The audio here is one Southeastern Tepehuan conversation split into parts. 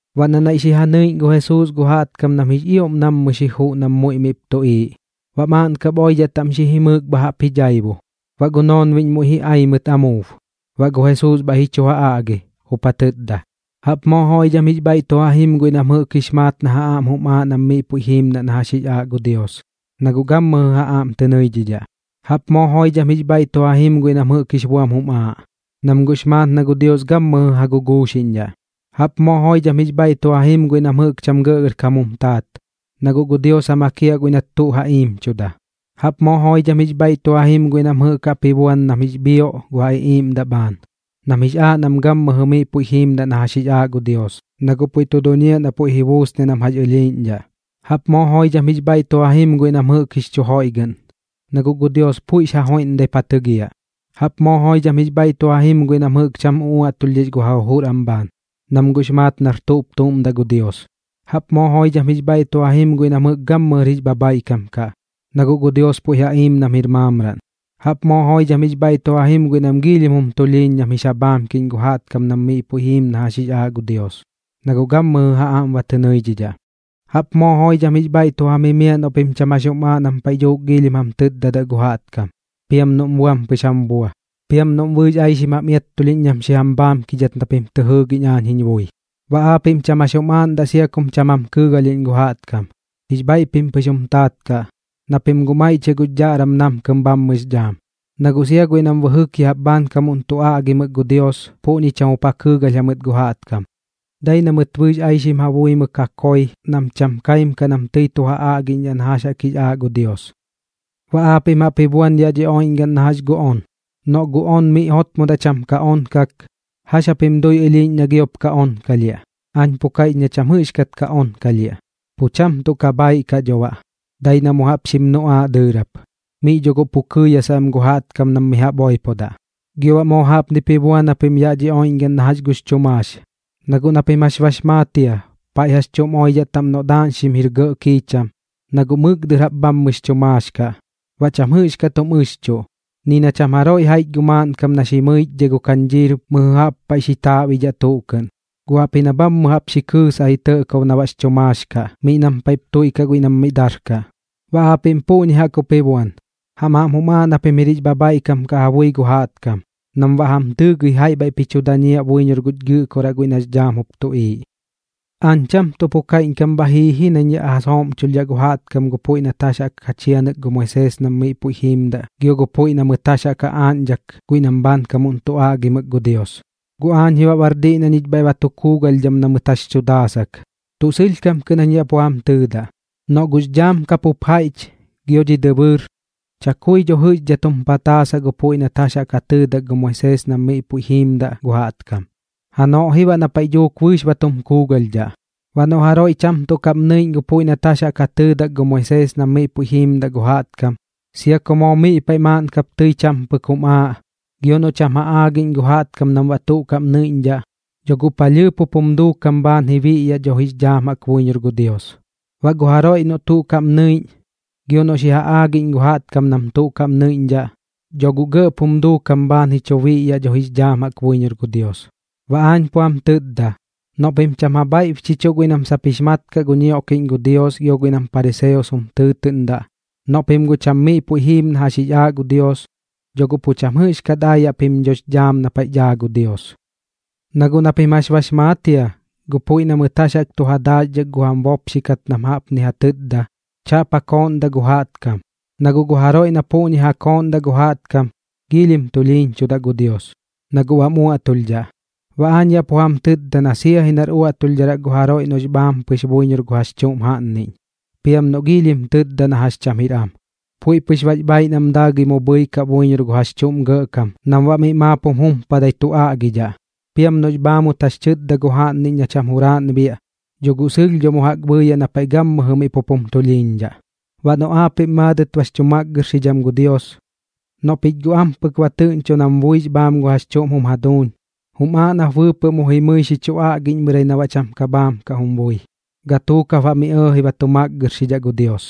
Baꞌ na naiꞌ xi ja nɨiꞌñ gu Jesuus gu jaꞌtkam nam jix ioꞌm nammɨ xi juꞌ nam muiꞌ miꞌp tuꞌiiꞌ, baꞌ maaꞌn kap oidhaꞌ taꞌm xi jimɨɨk bha jaꞌp ji dhaibo. Baꞌ gu noonbiꞌñ muiꞌ ji ai mɨt amuub, baꞌ gu Jesuus bhaiꞌ ji chu ja aꞌgi, jup ja tɨtda: ―Jaꞌp moo joidham jix bhaiꞌ tu ja jim guiꞌ nam jɨꞌk jix maat na ja aꞌm jum aaꞌ nam miꞌ puiꞌ jiimdaꞌ na jax jix aaꞌ gu Dios, na guꞌ gammɨjɨ ja aꞌm tɨ nɨidhidhaꞌ. ’Jaꞌp moo joidham jix bhaiꞌ tu ja jim guiꞌ nam jɨꞌk jix buam jum aaꞌ, nam guꞌx maat na gu Dios gammɨjɨ ja guguuxiꞌñdhaꞌ. ’Jaꞌp moo joidham jix bhaiꞌ tu ja jim guiꞌ nam jɨꞌk cham gɇꞌgɇrkam jum taat, na guꞌ gu Dios ja makiaꞌ guiꞌ nat tuꞌ ja iimchuda. ’Jaꞌp moo joidham jix bhaiꞌ tu ja jim guiꞌ nam jɨꞌk jaꞌp ji buan nam jix bhioꞌ gu ja iꞌiiꞌmdaꞌ am bhaan, nam jix aaꞌ nam gammɨjɨ miꞌ puiꞌ jiimdaꞌ na jax jix aaꞌ gu Dios, na guꞌ puiꞌ tu duñiaꞌ na puiꞌ ji buusniaꞌ nam jax ɨlhiiꞌñdhaꞌ. ’Jaꞌp moo joidham jix bhaiꞌ tu ja jim guiꞌ nam jɨꞌk jix chu joiꞌgɨꞌn, na guꞌ gu Dios puiꞌx joiꞌmdaip ja tɨgiaꞌ. ’Jaꞌp moo joidham jix bhaiꞌ tu ja jim guiꞌ nam jɨꞌk cham uꞌuaꞌtulhdhix gu ja jujur am bhaan, nam guꞌx maat nar tuꞌp tuꞌm daꞌ gu Dios. ’Jaꞌp moo joidham jix bhaiꞌ tu ja jim guiꞌ nam jɨꞌk gammɨjɨr jix bhabhaiꞌkam kaꞌ, na guꞌ gu Dios puiꞌ ja iim nam jir maamraꞌn. ’Jaꞌp moo joidham jix bhaiꞌ tu ja jim guiꞌ nam giilhim jum tulhiiñ nam jix ja bhaamkiꞌñ gu jaꞌtkam nam miꞌ puiꞌ jiim na jax jix aaꞌ gu Dios, na guꞌ gammɨjɨ ja aꞌm ba tɨ nɨidhidhaꞌ. ’Jaꞌp moo joidham jix bhaiꞌ tu jam jimiaꞌ noꞌ pim cham jax jum aaꞌ nam paiꞌ dhuuk giilhim jam tɨtdadaꞌ gu jaꞌtkam, piam noꞌm buam pɨx jam bua, piam noꞌm bɨɨx aixim jam iattulhiꞌñ nam xi jam bhaamkidhat na pim tɨ jɨɨgiꞌñ aañ jiñ bui. Baꞌ aapiꞌm cham jax jum aaꞌndaꞌ sia kum cham jam kɨɨgalhiꞌñ gu jaꞌtkam, jix bhaiꞌ pim pɨx jum taat kaꞌ, na pim guꞌ maiꞌchiaꞌ gux dhaꞌram namkɨm bhammɨx dhaam. Na guꞌ sia guiꞌ nam jɨꞌk bɨjɨk ya jaꞌp bhaankam jup tu aꞌgimɨk gu Dios puꞌñi cham jup ja kɨɨgalh jamɨt gu jaꞌtkam, dai na mɨt bɨɨx aixim ja buimɨk ja koi nam cham ja kaim kaꞌ nam tɨi tu ja aagiꞌñdhaꞌ na jax jaꞌk jix aaꞌ gu Dios. ’Baꞌ aapiꞌm jaꞌp ji buan yaꞌ dhi oiꞌñgaꞌn na jax gu on. Noꞌ gu on miꞌ jotmodaꞌ cham ka onkak, ¿jax japim dui ɨlhiiꞌñ na giop ka onkalhiaꞌ? Aañ pu kaiꞌch na cham jɨꞌxkat ka onkalhiaꞌ, pu cham tuꞌ ka bhaiꞌ kaꞌ dho baꞌ, dai na mu jaꞌp xim nuꞌaaꞌ dɨɨrap. Miꞌ dho guꞌ pu kɨɨyasaꞌ am gu jaꞌtkam nam mi jaꞌp oipodaꞌ. ’Gio baꞌ moo jaꞌpnip ji buan japim yaꞌ dhi oiꞌñgaꞌn na jax gux chu maax, na guꞌ na pim jax bax maat jia paiꞌ jax chuꞌm oidhaꞌ taꞌm noꞌ daaꞌñxim jir gɇꞌ kiicham, na guꞌ mɨk dɨr jaꞌp bhammɨx chu maax kaꞌ, baꞌ cham jɨꞌxkat jum ɨxchuꞌ. Ni na cham jaroiꞌ jaiꞌch gu maaꞌnkam na xi mɨichdhai gu kañdhiir mɨjɨ jaꞌp paiꞌ xi chaaꞌbidhaꞌ tuꞌ kɨꞌn, guꞌ jaꞌpji na bhammɨ jaꞌp xi kɨɨsaꞌ ji tɇꞌkob na baꞌx chu maax kaꞌ miꞌ nam paiꞌp tuiꞌkaꞌ guiꞌ nam miꞌ darkaꞌ. Baꞌ aapiꞌm puꞌñi jaꞌk jup ji buan, jam aꞌm jum aaꞌ na pim jir jix bhabhaiꞌkam kaꞌ ja bui gu jaꞌtkam nam baꞌ ji jam tɨɨgɨi jaiꞌ bhaiꞌp ji chu dañiaꞌ buiñor guñ Gɨꞌkoraꞌ guiꞌ nax dhaam jup tuꞌiiꞌ. ’Aañ cham tuꞌ pu kaiꞌñkam bha jii ji nañ yaꞌ ja sooꞌmchulhdhaꞌ gu jaꞌtkam gu puiꞌ nat jax jaꞌk ja chianɨk gu Moisees nam miꞌ puiꞌ jiimdaꞌ gio gu puiꞌ na mɨt jax jaꞌk ja aaꞌñdhak guiꞌ nam bhaankamuꞌn tu aꞌgimɨk gu Dios, guꞌ aañ ji baꞌr diꞌ na ñich bhaiꞌ ba tu kuugalhdham na mɨt jax tu daasak. Tuꞌ sɨlhkam kɨꞌn jañ yaꞌ pu jam tɨtda, noꞌ gux dhaam ka pup jaiꞌch gio dhi dɨbɨɨr, chakui dho jɨꞌxdhat jum pataasaꞌ gu puiꞌ nat jax jaꞌk ja tɨɨdak gu Moisees nam miꞌ puiꞌ jiimdaꞌ gu jaꞌtkam, janoꞌ ji baꞌ na paiꞌ dhuuk bɨɨx ba tum kuugalhdhaꞌ. Baꞌ noꞌ jaroiꞌ cham tuꞌ kaꞌm nɨiꞌñ gu puiꞌ nat jax jaꞌk ja tɨɨdak gu Moisees nam miꞌ puiꞌ jiimdaꞌ gu jaꞌtkam, sia ku moo miꞌ paiꞌ maaꞌn kap tɨi cham pɨk jum aaꞌ, gio noꞌ cham ja aagiꞌñ gu jaꞌtkam nam baꞌ tuꞌ kaꞌm nɨiꞌñdhaꞌ, dho guꞌ palhɨɨp jup jum duukam bhaan ji biꞌyaꞌ dho jix dhaam jaꞌk buiñor gu Dios. Baꞌ gu jaroiꞌ noꞌ tuꞌ kaꞌm nɨiꞌñ, gio noꞌ xi ja aagiꞌñ gu jaꞌtkam nam tuꞌ kaꞌm nɨiꞌñdhaꞌ, dho guꞌ gɇꞌp jum duukam bhaan ji chu biꞌyaꞌ dho jix dhaam jaꞌk buiñor gu Dios. Baꞌ aañ pu jam tɨtda, noꞌ pim cham ja bhaiꞌbchichuꞌ guiꞌ nam sap jix maat kaꞌ gu ñioꞌkiꞌñ gu Dios gio guiꞌ nam pariseos jum tɨɨtɨꞌndaꞌ, noꞌ pim guꞌ cham miꞌ puiꞌ jiim na jax jix aaꞌ gu Dios, dho guꞌ pu cham jɨꞌxkat aayaꞌ pim dhox dhaam na paiꞌ daa gu Dios. ’Na guꞌ na pim jax bax maat jia gu puiꞌ na mɨt jax jaꞌk tu ja daaxdhak gu jam bopxi kat nam jaꞌpni ja tɨtda: “Chaꞌp ja kooꞌndaꞌ gu jaꞌtkam, na guꞌ gu jaroiꞌ na puꞌñi ja kooꞌndaꞌ gu jaꞌtkam, giilhim tulhiiñchudaꞌ gu Dios, na guꞌ bam uaꞌtulhdhaꞌ.” Baꞌ aañ yaꞌ pu jam tɨtda na sia ji nar uaꞌtulhdharaꞌ gu jaroiꞌ noꞌx bhaam pɨx buiñor gu jax chuꞌm jaꞌnniꞌñ, piam noꞌ giilhim tɨtda na jax cham jir am. Puiꞌ pɨx bax bhaaiꞌ nam daagɨi mu bhɨikaꞌ buiñor gu jax chuꞌm gɇꞌkam nam baꞌ miꞌ maap jum jumpadai tu aꞌgidhaꞌ. Piam noꞌx bhaamut jax tɨtda gu jaꞌnniꞌñ na cham juraaꞌn biaꞌ, dho guꞌ pu jimiaꞌ dho mu jaꞌk na paiꞌ gammɨjɨ miꞌ pup jum tulhiiñdhaꞌ. ’Baꞌ noꞌ aapiꞌm maadɨt bax chu makgɨrxidham gu Dios, noꞌ pich guꞌ ampɨk ba tɨꞌñcho nam buix bhaam gu jax chuꞌm jum jaduuñ, jum aaꞌ nap bɨɨpɨꞌ mu jimɨi xi chu aꞌgiꞌñmɨrai na baꞌ cham ka bhaam kaꞌm bui. Gatuuk jap baꞌ miꞌ ɇɇji ba tu makgɨrxidhaꞌ gu Dios.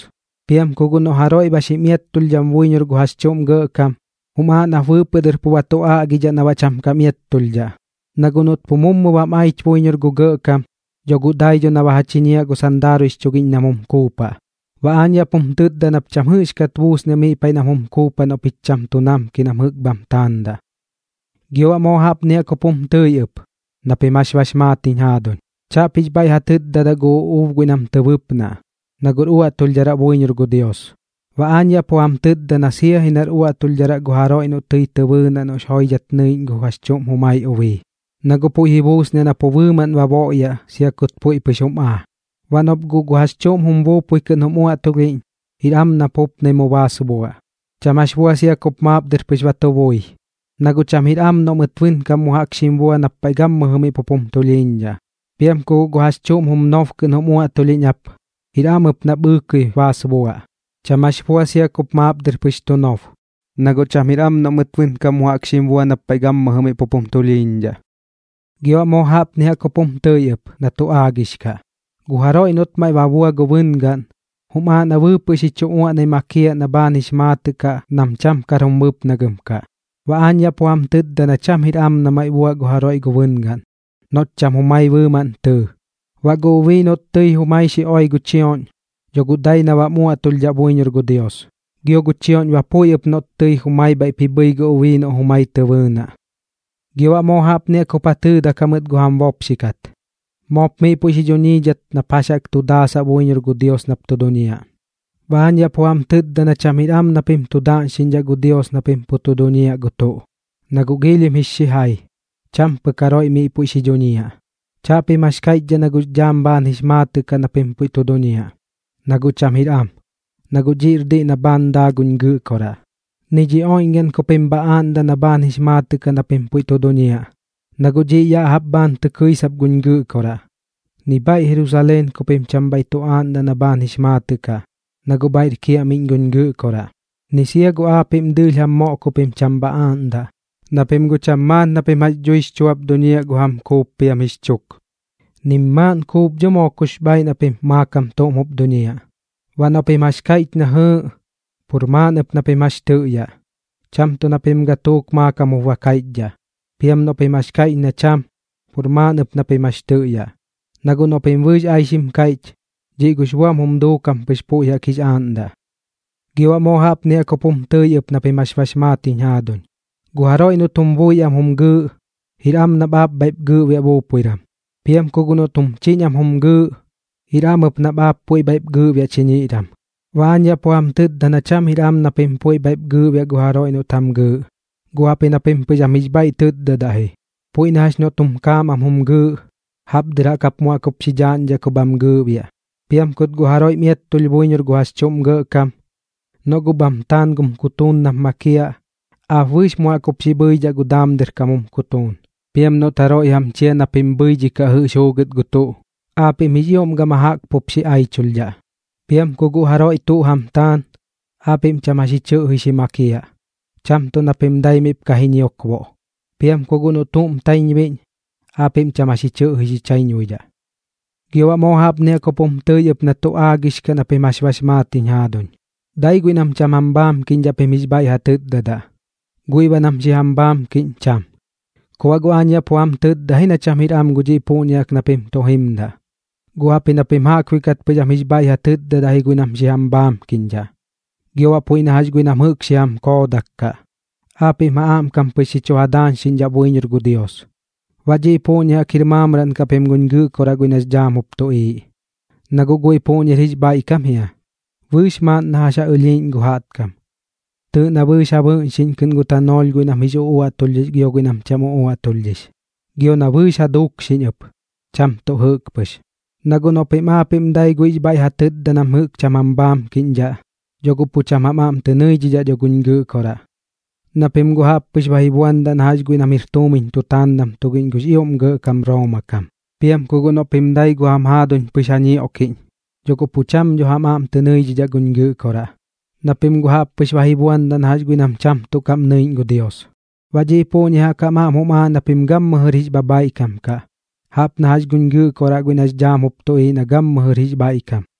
’Piam ku guꞌ noꞌ jaroiꞌ ba xim iattulhdham buiñor gu jax chuꞌm gɇꞌkam, jum aaꞌ nap bɨɨpɨꞌ dɨr pu ba tu aꞌgidhaꞌ na baꞌ cham kam iattulhdhaꞌ. Na guꞌ noꞌt pu mummɨ bam aich buiñor gu gɇꞌkam, dho guꞌ dai dho na ba ja chiñiaꞌ gu sandaaruiꞌx chugiꞌñ nam jum kuupaꞌ. Baꞌ aañ yaꞌ pum tɨtda nap cham jɨꞌxkat buusniaꞌ miꞌ paiꞌ nam jum kuupaꞌ noꞌ pich cham tu namki nam jɨꞌk bham taandaꞌ. ’Gio baꞌ moo jaꞌpni jaꞌk jup jum tɨi ɨp na pim jax bax maat jiñ jaaduñ: “Chaꞌp jix bhaiꞌ ja tɨtdadaꞌ gu uꞌuub guiꞌ nam tɨ bɨpnaꞌ, na guꞌr uaꞌtulhdharaꞌ buiñor gu Dios.” ’Baꞌ aañ yaꞌ pu jam tɨtda na sia ji nar uaꞌtulhdharaꞌ gu jaroiꞌ noꞌ tɨi tɨ bɨɨnaꞌ noꞌx joidhat nɨiꞌñ gu jax chuꞌm jumai ubii, na guꞌ puiꞌ ji buusniaꞌ na pu bɨɨmaꞌn ba boꞌyaꞌ sia kut puiꞌ pɨx jum aa. ’Baꞌ noꞌp guꞌ gu jax chuꞌm jum bui kɨꞌn jum uaꞌtulhiꞌñ, jir am nap jupnai baas buaꞌ. Cham jax bua sia kup maap dɨr pɨx ba tu bui, na guꞌ cham jir am noꞌ mɨt bɨnkam mu jaꞌk xim bua nap paiꞌ gammɨjɨ miꞌ pup jum tulhiiñdhaꞌ. Piam ku guꞌ gu jax chuꞌm jum nob kɨꞌn jum uaꞌtulhiꞌñ ap, jir am ɨp nap ɨɨkɨi baas buaꞌ. Cham jax bua sia kup maap dɨr pɨx tu nob, na guꞌ cham jir am noꞌ mɨt bɨnkam mu jaꞌk xim bua nap paiꞌ gammɨjɨ miꞌ pup jum tulhiiñdhaꞌ. ’Gio baꞌ moo jaꞌpni jaꞌk jup jum tɨi ɨp na tu aagix kaꞌ: “Gu jaroiꞌ noꞌt maiꞌ ba bua gu bɨngaꞌn, jum aaꞌ na bɨɨpɨꞌ xi chu uaꞌnai makiaꞌ na baꞌ bhaan jix maatɨt kaꞌ nam cham kar jum bɨpnagɨm kaꞌ.” Baꞌ aañ yaꞌ pu jam tɨtda na cham jir am na maiꞌ buaꞌ gu jaroiꞌ gu bɨngaꞌn noꞌt cham jumai bɨɨmaꞌn tɨɨ. Baꞌ gu ubii noꞌt jumai tɨi xi oi gu chioꞌñ, dho guꞌ dai na bam uaꞌtulhdhaꞌ buiñor gu Dios, gio gu chioꞌñ ba puiꞌ ɨp noꞌt tɨi jumai bhaiꞌp ji bhɨi gu ubii noꞌ jumai tɨ bɨɨnaꞌ. ’Gio baꞌ moo jaꞌpni jaꞌk jup ja tɨɨdak jamɨt gu jam bopxi kat: “Moop miꞌ puiꞌ xi dhuñiidhat nap jax jaꞌk tu daasaꞌ buiñor gu Dios nap tu duñiaꞌ.” Baꞌ aañ yaꞌ pu jam tɨtda na cham jir am na pim tu daꞌñxiꞌñdhaꞌ gu Dios na pim pu tu duñiaꞌ gu tuꞌ, na guꞌ giilhim jix xijai, cham pɨk jaroiꞌ miꞌ puiꞌ xi dhuñiaꞌ. Chaꞌpim jax kaiꞌchdhaꞌ na gux dhaam bhaan jix maatɨꞌ kaꞌ na pim puiꞌ tu duñiaꞌ, na guꞌ cham jir am, na guꞌ dhiꞌr diꞌ na bhaan daa guñ Gɨꞌkoraꞌ. Ni dhi oiꞌñgaꞌn ku pim bha aaꞌndaꞌ na bhaan jix maatɨꞌ kaꞌ na pim puiꞌ tu duñiaꞌ, na guꞌ dhiꞌ ya jaꞌp bhaan tɨ kɨisap guñ Gɨꞌkoraꞌ. Ni bhaiꞌ Jerusaleen ku pim cham bhaiꞌ tu aaꞌndaꞌ na bhaan jix maatɨꞌ kaꞌ, na guꞌ bhaiꞌr kiaꞌmiꞌñ guñ Gɨꞌkoraꞌ. Ni sia gu aapiꞌm dɨɨlh jam moꞌ ku pim cham bha aaꞌndaꞌ, na pim guꞌ cham maat na pim jax dhui jix chuap duñiaꞌ gu jam kuup piam jix chuk, nim maaꞌn kuup dho moo kux bhaaiꞌ na pim maakam tuꞌm jup duñiaꞌ. Baꞌ noꞌ pim jax kaiꞌch na jɨɨꞌ, pur maaꞌn ɨp na pim jax tɨꞌyaꞌ, cham tuꞌ na pim gatuuk maakam jup ba kaiꞌchdhaꞌ. Piam noꞌ pim jax kaiꞌch na cham, pur maaꞌn ɨp na pim jax tɨꞌyaꞌ. Na guꞌ noꞌ pim bɨɨx aixim kaiꞌch, dhiꞌ gux buam jum duukam pɨx puiꞌ jaꞌk jix aaꞌndaꞌ. ’Gio baꞌ moo jaꞌpni jaꞌk jup jum tɨi ɨp na pim jax bax maat jiñ jaaduñ: “Gu jaroiꞌ noꞌt jum bui am jum gɨɨꞌ, jir am nap aap puiꞌ bhaiꞌp gɨɨꞌbiaꞌ buiꞌran. Piam ku guꞌ noꞌt jum chiñ am jum gɨɨꞌ, jir am ɨp nap aap puiꞌ bhaiꞌp gɨɨꞌbiaꞌ chiñiꞌran.” Baꞌ aañ yaꞌ pu jam tɨtda na cham jir am na pim puiꞌ bhaiꞌp gɨɨꞌbiaꞌ gu jaroiꞌ noꞌt jam gɨɨꞌ, guꞌ jaꞌpji na pim pɨx am jix bhaiꞌ tɨtdadaꞌ ji. Puiꞌ na jax noꞌt jum kaam am jum gɨɨꞌ, jaꞌp dɨr jap mu jaꞌk jup xi dhaaꞌñdhaꞌ ku bham gɨɨꞌbiaꞌ. Piam kut guꞌ jaroiꞌm iattulh buiñor gu jax chuꞌm gɇꞌkam, noꞌ guꞌ bham taan gum kutuun nap makiaꞌ, aap bɨɨx mu jaꞌk jup xi bhɨidhaꞌ gu daam dɨr kam jum kutuun. Piam noꞌt guꞌ jaroiꞌ jam chia na pim bhɨidhikaꞌ jɨꞌx juugɨt gu tuꞌ, aapiꞌm jix ioꞌm gama jaꞌk pup xi aichulhdhaꞌ. Piam ku guꞌ jaroiꞌ tuꞌ jam taan, aapiꞌm cham jax ji chɨꞌji xi makiaꞌ, cham tuꞌ na pim dai miꞌp ka ji ñiokboꞌ. Piam ku guꞌ noꞌ tuꞌm taiñbuiꞌñ, aapiꞌm cham jax ji chɨꞌji xi chaiñbuidhaꞌ. ’Gio baꞌ moo jaꞌpni jaꞌk jup jum tɨi ɨp na tu aagix kaꞌ na pim jax bax maat jiñ jaaduñ: “Dai guiꞌ nam cham jam bhaamkiꞌñdhaꞌ pim jix bhaiꞌ ja tɨtdadaꞌ, guiꞌ baꞌ nam xi jam bhaamkiꞌñ cham.” Ku baꞌ guꞌ aañ yaꞌ pu jam tɨtda ji na cham jir am gu dhiꞌ puꞌñi jaꞌk na pim tu jimdaꞌ, guꞌ jaꞌpji na pim jaꞌkbuiꞌ kat pɨx am jix bhaiꞌ ja tɨtdadaꞌ ji guiꞌ nam jɨꞌk xi jam bhaamkiꞌñdhaꞌ. Gio baꞌ puiꞌ na jax guiꞌ nam jɨꞌk xi jam koodak kaꞌ, aapiꞌm ja aꞌmkam pɨx xi chu ja daañxidaꞌ buiñor gu Dios. Baꞌ dhiꞌ puꞌñi jaꞌk jir maamraꞌn kaꞌ pim guñ Gɨꞌkoraꞌ guiꞌ nax dhaam jup tuꞌiiꞌ, na guꞌ guiꞌ puꞌñir jix bhaiꞌkam jia, bɨɨx maaꞌn na jax ja ɨlhiiꞌñ gu jaꞌtkam. Tɨɨꞌ na bɨɨx ja bɨꞌñxiꞌñ kɨꞌn gu tanoolh guiꞌ nam jix uꞌuaꞌtulhdhix gio guiꞌ nam cham uꞌuaꞌtulhdhix, gio na bɨɨx ja dukxiꞌñ ɨp, cham tuꞌ jɨꞌk pɨx. Na guꞌ noꞌ pim aapiꞌm dai guiꞌx bhaiꞌ ja tɨtda nam jɨꞌk cham jam bhaamkiꞌñdhaꞌ, dho guꞌ pu cham jam aꞌm tɨ nɨidhidhaꞌ dho guñ Gɨꞌkoraꞌ, na pim guꞌ jaꞌp pɨx ba ji buandaꞌ na jax guiꞌ nam jir tuumiñ tutaandam tugiꞌñ gux ioꞌm gɇꞌkam Rooma kam. Piam ku guꞌ noꞌ pim dai gu jam jaaduñ pɨx ja ñioꞌkiꞌñ, dho guꞌ pu cham dho jam aꞌm tɨ nɨidhidhaꞌ dho guñ Gɨꞌkoraꞌ, na pim guꞌ jaꞌp pɨx ba ji buandaꞌ na jax guiꞌ nam cham tuꞌ kaꞌm nɨiꞌñ gu Dios. Baꞌ dhiꞌ puꞌñi jaꞌk jam aꞌm jum aaꞌ na pim gammɨjɨr jix bhabhaiꞌkam kaꞌ, jaꞌp na jax guñ Gɨꞌkoraꞌ guiꞌ nax dhaam jup tuꞌiiꞌ na gammɨjɨr jix bhaiꞌkam.